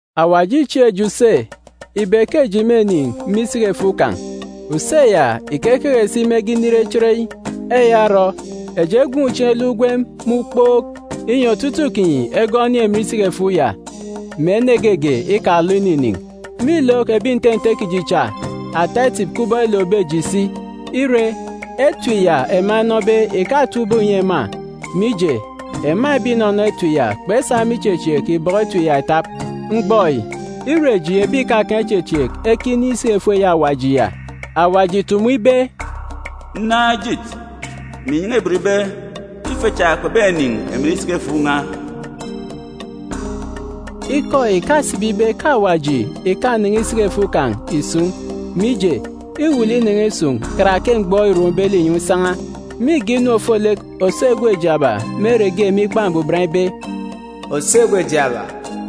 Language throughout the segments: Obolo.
Awaji îchieek eji use ibe ke eji mênin̄ isiki-efuuk kan̄. Use ya ìkekeke si mege inire chereyi. Eya orọ, eji egwuun̄ chieen̄ eluk ugwem me ukpook, inyi otutuuk kinyi egọọk enin̄ emen isiki-efuuk ya, mè ene geege ikalọ ininin̄. Mîlook ebi nte nte kiji cha ata etip kubọk elookbe eji si. Ire, etip ya ema enọbe ìkatap ubọk ìnyi ema, mije, ema ebi ìnọnọ etip ya kpesa me ichechieek ibọkọ etip ya itap. Mgbọ yi, îre eji ebi ìkakaan̄ ichechieek ekinin̄ isiki-efuuk eyi Awaji ya. Awaji ìtumu ibe, “Nnaan̄ ejit, mè inyan̄a ibot ibe ke ife cha kpebenin̄ emen isiki-efuuk n̄a.”a Ikọ yi ìkasibi ibe ke Awaji ìkanen̄e isiki-efuuk kan̄ ìsun̄, mije, îwuuk lek inen̄e isun̄ karake mgbọ îrombe linyọn̄ isan̄a. Mîge inu ofolek òso egwe jaaba me ere ge me Ikpa Mbuban ibe, “Òso egwe jaaba,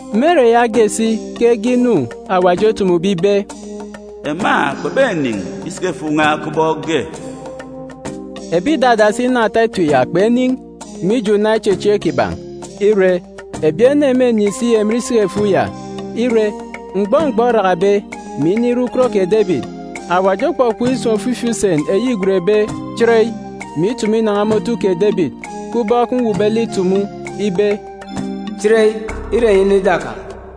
Me ere yaage si ke ege inu Awaji otumube ibe, “Ema kpebenin̄ isiki-efuuk n̄a kubọk ge.” Ebi ìdadasi inọ ata etip ya kpenin̄, mije una ichechieek kiban̄. Ire, ebi ene mênin̄ si emen isiki-efuuk ya. Ire, mgbọ mgbọ orakabe, mè inire ukot kè Debit, Awaji okpọkpọk isun̄ ofifi usen eyi îgwenbe “chereyi,” mè itumu inan̄a me otu kè Debit, kubọk mwuukbe lek itumu, ibe, “Chereyi, ire enyi inọ ida kan̄,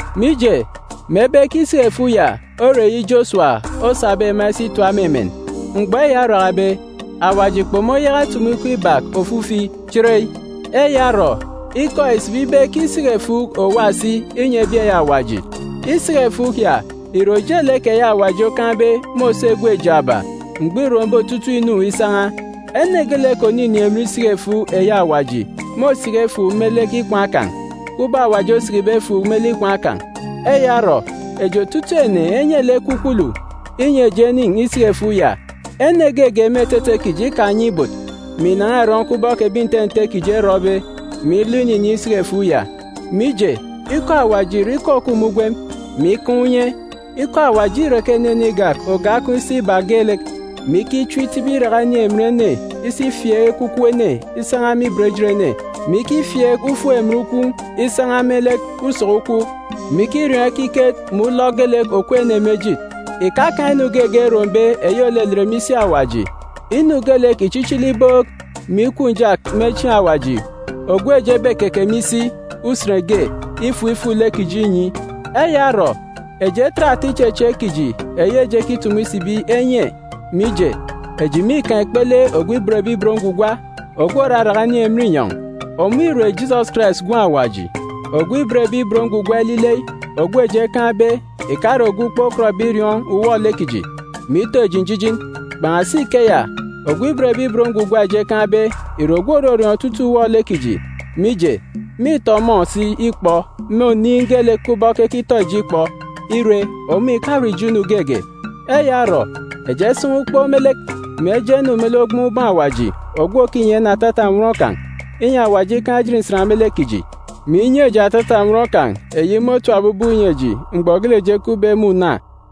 Mije, mebe ke isiki-efuuk ya ore eyi Josuwa osabe ema isi itap me emen, mgbọ eya orakabe, Awaji kpomoyaka itumu ikọ ibak ofifi “chereyi.” Eya orọ, ikọ yi ìsibi ibe ke isiki-efuuk òwa si inyi ebi eyi Awaji. Isiki-efuuk ya ìre ojelek eyi Awaji okaan̄be me òso egwe jaaba, mgbọ îrombe otutuuk inu isan̄a. Ene geelek òninin̄ emen isiki-efuuk eyi Awaji môsiki efuuk me lek ikwaan̄ kan̄, kubọk Awaji osikibe efuuk me lek ikwaan̄ kan̄. Eya orọ, eji otutuuk ene enye lek ekwukwulu, inyi eji enin̄ isiki-efuuk ya. Ene geege me etete kiji ikanye ibot, mè ìnan̄a ìrọn̄ kubọk ebi nte nte kiji erọbe, mè ilọ ininin̄ isiki-efuuk ya. Mije, ikọ Awaji ìre ikọ òkup me ugwem, mè ikaan̄ unye. Ikọ Awaji îreke enenen igak oge akọn̄ isi iba geelek, mè ikichim itibi iraka inin̄ emen ene isi ifieek ekwukwu ene isan̄a me lek ibot ejit ene, mè ikifieek ufuk emen ukwuuk isan̄a me lek usọk ukwuuk, mè ikiriọọn̄ ekiket mè ulọk geelek òkup ene me ejit. Ìkakaan̄ inu geege erombe eyi òlelet me isi Awaji. Inu geelek ìchichili ibook, mè ikup njak me chieen̄ Awaji ogwu eji ebekeke me isi, usen ge, ifuk ifuk lek kiji inyi. Eya orọ, eji etet ata ichechieek kiji eyi eji ekitumu isibi enye, mije, eji mîkaan̄ ikpele ogwu òban Awaji, ogwu òraraka inin̄ emen inyọn̄. Ọmọ ìre Jisọs Karais Gwun̄ Awaji. Ogwu òban Awaji ilile ogwu eji ekaan̄be ìkare ogwu kpokọtbe iriọọn̄ uwọ-lek kiji, mè ito eji njijin. Kpan̄asi ikeya, ogwu òban Awaji eji ekaan̄be ìre ogwu òrọriọọn̄ otutuuk uwọ-lek kiji, mije, mîtọ ọmọ si ikpọ me oniin̄ geelek, kubọk ekitọ eji ikpọ, ire, ọmọ ìkarọ ijo inu geege. Eya orọ, eji esan̄a ukpook me lek, mè eje enu me lek ogboon̄ ubọọn̄ Awaji ogwu òkinyi ene atata nnwọn kan̄, inyi Awaji ikaan̄ ejit nsan me lek kiji, mè inyi eji atata nnwọn kan̄ eyi môtapbe ubọk inyi eji mgbọ geelek eji ekupbe me una.